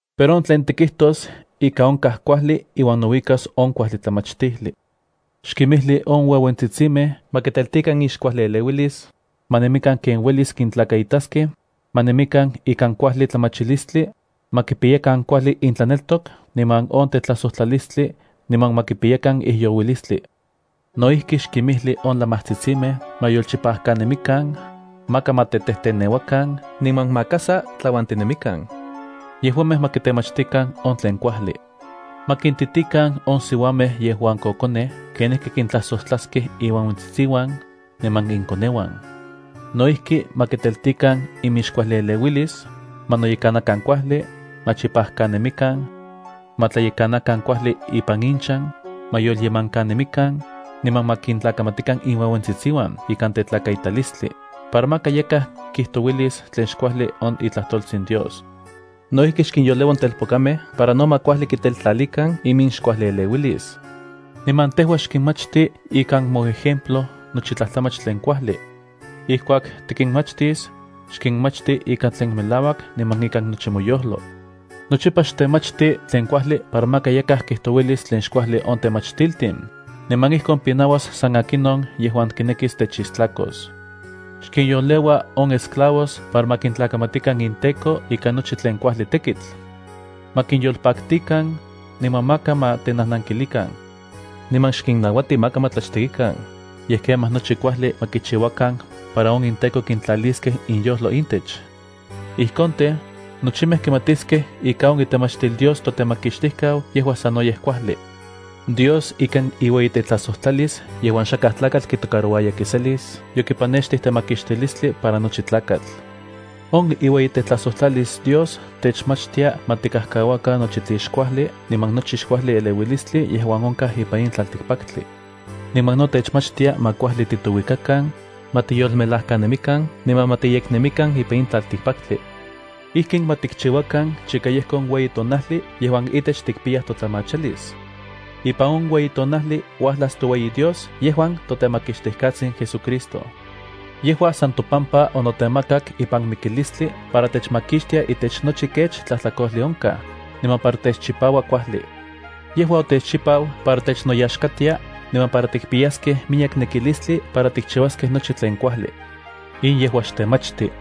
Pero on tlen tikijtos ika onkaj kuajli iuan nouikas on kuajli tlamachtijli. Xkimijli on ueuentsitsimej ma kintelti inxkuajlieleuilis, ma nemikan ken uelis kintlakaitaskej, ma nemikan ikan kuajli tlamachilistli, ma kipiyakan kuajli intlaneltok niman on tetlajsojtlalistli niman ma kipiyakan ijyouilistli. No ijki xkimijli on lamajtsitsimej ma yolchipajkanemikan, maka ma tetejteneuakan niman maka sa tlauantinemikan. Yejuamej ma kitemachtikan on tlen kuajli. Ma kintitikan on siuamej yejuan kokonej kenijki kintlajsojtlaskej inueuentsitsiuan, niman inkoneuan. No ijki ma kiteltikan iminxkuajlieleuilis, ma noyekanakan kuajli, ma chipajkanemikan, ma tlayekanakan kuajli ipan inchan, ma yolyemankanemikan, niman ma kintlakamatikan inueuentsitsiuan ikan tetlakaitalistli, para maka yakaj kijtouilis tlen xkuajli on itlajtoltsin Dios. No ijki xkinyoleua on telpokamej para no ma kuajli kitetlalikan iminxkuajlieleuilis. Niman tejua xkinmachti ikan moejemplo nochi tlajtlamach tlen kuajli. Ijkuak tikinmachtis, xkinmachti ikan tlen melauak niman ikan nochi moyojlo. Nochipa xtemachti tlen kuajli para maka yakaj kijtouilis tlen xkuajli on temachtiltin, niman ijkon pinauas san akinon yejuan kinekis techistlakos. Xkinyoleua on esclavos para ma kintlakamatikan inteko ikan nochi tlen kuajli tekitl. Ma kinyolpaktikan, niman maka ma tenajnankilikan. Niman xkinnauati maka ma tlachtekikan, yej kemaj nochi kuajli ma kichiuakan para on inteko kintlaliskej inyojlo intech. Ijkon tej, nochimej kimatiskej ika on itlemachtil Dios toTemakixtijkau yejua sanoyej kuajli. Dios ikan iueyitetlajsojtlalis yejuan xakaj tlakatl kitocarouaya kiselis yokipanextij temakixtilistli para nochi tlakatl. On iueyitetlajsojtlalis Dios techmachtia ma tikajkauakan nochi tlen xkuajli niman nochi xkuajli eleuilistli yejuan onkaj ipan in tlaltikpaktli. Niman no techmachtia ma kuajli titouikakan, ma tiyolmelajkanemikan niman ma tiyeknemikan ipan in tlaltikpaktli. Ijkin ma tikchiuakan chika yejko on ueyi tonajli yejuan itech tikpiyaj totlamachalis. Ipan on ueyi tonajli uajlas toueyi Dios yejuan toTemakixtijkatsin JesuCristo. Yejua san topampa onotemakak ipan mikilistli para techmakixtia itech nochi kech tlajtlakojli onkaj, niman para techchipaua kuajli. Yejua otechchipau para technoyaxkatia, niman para tikpiyaskej miyek nekilistli para tikchiuaskej nochi tlen kuajli. In yejua xtemachti.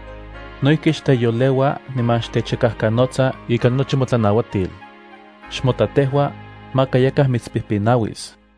No ijki xteyoleua niman xtechikajkanotsa ikan nochi motlanauatil. Xmota tejua, maka yakaj mitspijpinauis.